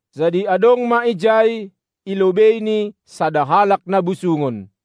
Jadi adong ma ijai, i lobeiNi, sada halak na busungon.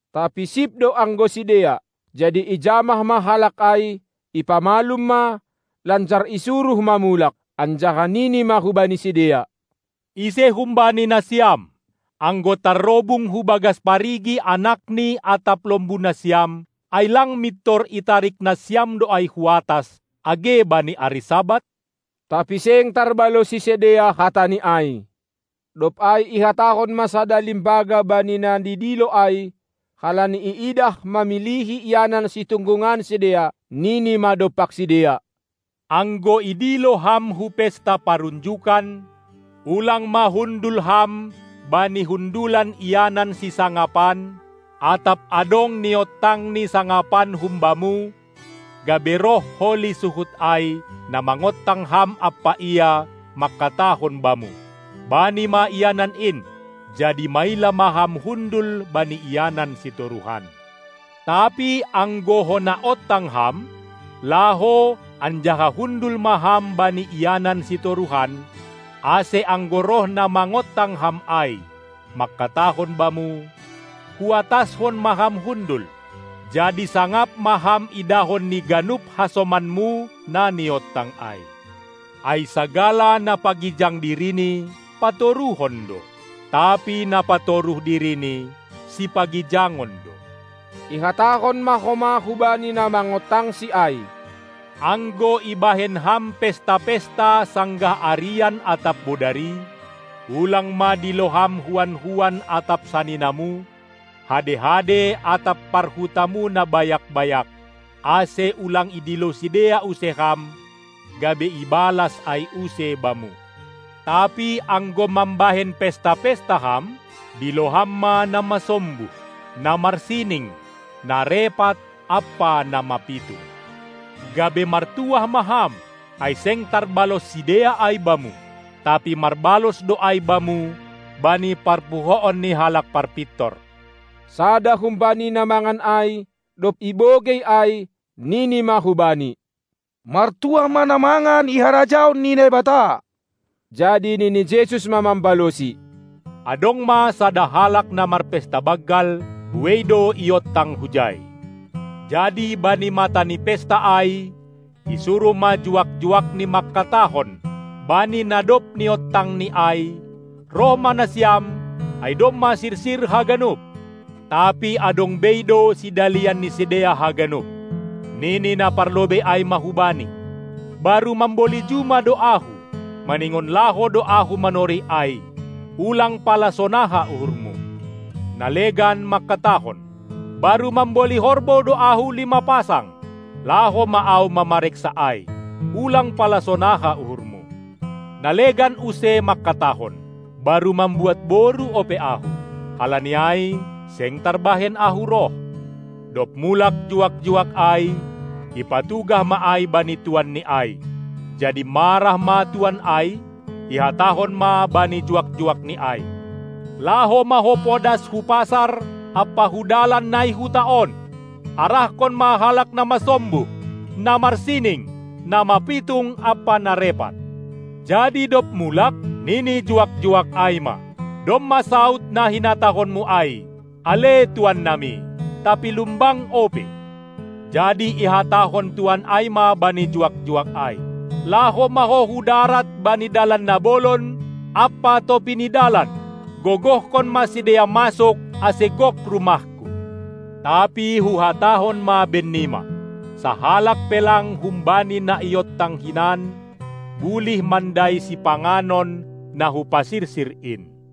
Tapi sip do anggo sidea. Jadi ijamah ma halak ai, ipamalum ma, lanjar isuruh ma mulak. Anjaha nini ma hubani sidea: Ise humbani nasiam, anggo tarrobung hubagas parigi anakni atap lombu nasiam, ai lang mintor itarik nasiam do ai hu atas, age bani ari Sabat? Tapi seng tarbalosi sidea hataNi ai. Dob ai ihatahon ma sada limbaga bani na nidilo ai, halani iidah mamilihi ianan situnggungan sidea, Nini ma dompak sidea: Anggo idilo ham hu pesta parunjukan, ulang ma hundul ham bani hundulan ianan sisangapan, atap adong niontangni sangapan humbamu, gabe roh holi suhut ai, na mangontang ham ampa ia, mangkatahon bamu: Bani ma ianan in! Jadi maila ma ham hundul bani ianan sitoruhan. Tapi anggo hona ontang ham, laho anjaha hundul ma ham bani ianan sitoruhan, ase anggo roh na mangontang ham ai, mangkatahon bamu: Hu atashon ma ham hundul! Jadi sangap ma ham idahon ni ganup hasomanmu na niontang ai. Ai sagala na pagijang dirini, patoruhon do, tapi na patoruh dirini, sipagijangon do. Ihatahon ma homa hubani na mangontangSi ai: Anggo ibahen ham pesta-pesta sanggah arian atap bodari, ulang ma dilo ham huan-huan atap saninamu, hade-hade atap parhutamu na bayak-bayak, ase ulang idilo sidea use ham, gabe ibalas ai use bamu. Tapi anggo mambahen pesta-pesta ham, dilo ham ma na masombuh, na marsining, na repat ampa na mapitung. Gabe martuah ma ham, ai seng tarbalos sidea ai bamu, tapi marbalos do ai bamu bani parpuhoon ni halak parpintor. Sada humbani na mangan ai, dob ibogei ai, nini ma hu Bani: Martuah ma na mangan i harajaon ni Naibata! Jadi nini Jesus ma mambalosi: Adong ma sada halak na marpesta banggal; buei do iontang hujai. Jadi bani mata ni pesta ai isuruh ma juak-juakni mangkatahon bani na dob niontangni ai: Roh ma nasiam, ai domma sirsir haganup! Tapi adong bei do sidalian ni sidea haganup. Nini na parlobei ai ma hubani: Baru mamboli juma do ahu, maningon laho do ahu manorih ai. Ulang pala sonaha uhurmu! Na legan mangkatahon: Baru mamboli horbou do ahu lima pasang; laho ma ahu mamareksa ai. Ulang pala sonaha uhurmu! Na legan use mangkatahon: Baru mambuat boru ope ahu, halani ai seng tarbahen ahu roh. Dob mulak juak-juak ai, ipatugah ma ai bani tuanni ai. Jadi marah ma tuan ai, ihatahon ma bani juak-juakni ai: Laho ma ho podas hu pasar ampa hu dalan na i huta on, arahkon ma halak na masombuh, na marsining, na mapitung ampa na repat. Jadi, dob mulak, nini juak-juak ai ma: Domma saud na hinatahonmu ai, ale tuan nami, tapi lumbang ope. Jadi ihatahon tuan ai ma bani juak-juak ai: Laho ma ho hu darat bani dalan na bolon ampa topi ni dalan, gogohkon ma sidea masuk ase gok rumahku! Tapi Huhatahon ma bennima: Sahalak pe lang humbani na niontang hinan bulih mandai sipanganon na Hupasirsir in.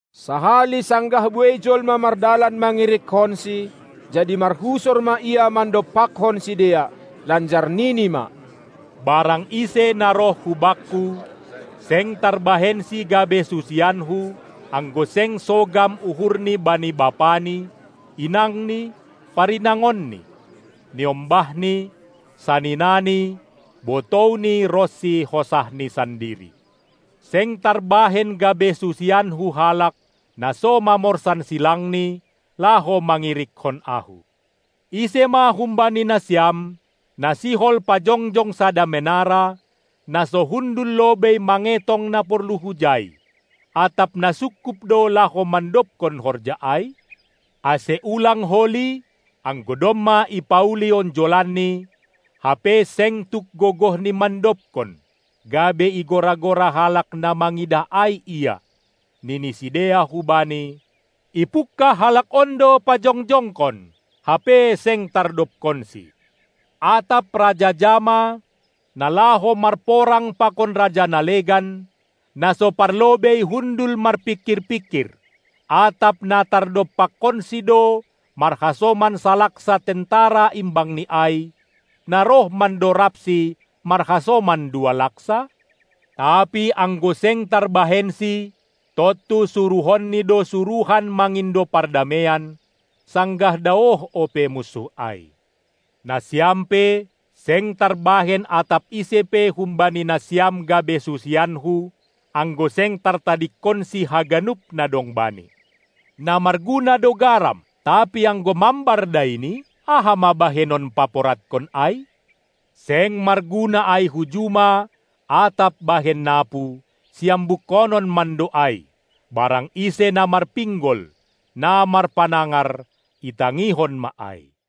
Sahali sanggah buei jolma mardalan mangirikkonSi, jadi marhusor ma Ia mandompakkon sidea, lanjar nini ma: Barang ise na roh hu Bakku, seng tarbahensi gabe susianKu, anggo seng sogam uhurni bani bapani, inangni, parinangonni, niombahni, saninani, botouni ronsi hosahni sandiri. Seng tarbahen gabe susianKu halak, na so mamorsan silangni, laho mangirikkon Ahu! Ise ma humbani nasiam, na sihol pajongjong sada menara, na so hundul lobei mangetong na porlu hujai, atap na sungkup do laho mandobkon horja ai? Ase ulang holi, anggo domma ipauli onjolanni, hape seng tuk gogohni mandobkon, gabe igora-gora halak na mangidah ai ia. nini sidea hubani: Ipungkah halak on do pajongjongkon, hape seng tardobkonsi. Atap raja ja ma, na laho marporang pakon raja na legan, na so parlobei hundul marpingkir-pingkir, atap na tardompakkonsi do marhasoman salaksa tentara imbangni ai, na roh mandorabsi marhasoman dua laksa? Tapi anggo seng tarbahensi, tontu suruhonni do suruhan mangindo pardameian, sanggah daoh ope munsuh ai. Nasiam pe, seng tarbahen atap ise pe humbani nasiam gabe susianKu, anggo seng tartadingkonsi haganup na dong bani. Na marguna do garam, tapi anggo mambar daini, aha ma bahenon paporadkon ai? Seng marguna ai hu juma atap bahen napu, siambukkonon mando ai. Barang ise na marpinggol, na marpanangar, itangihon ma ai.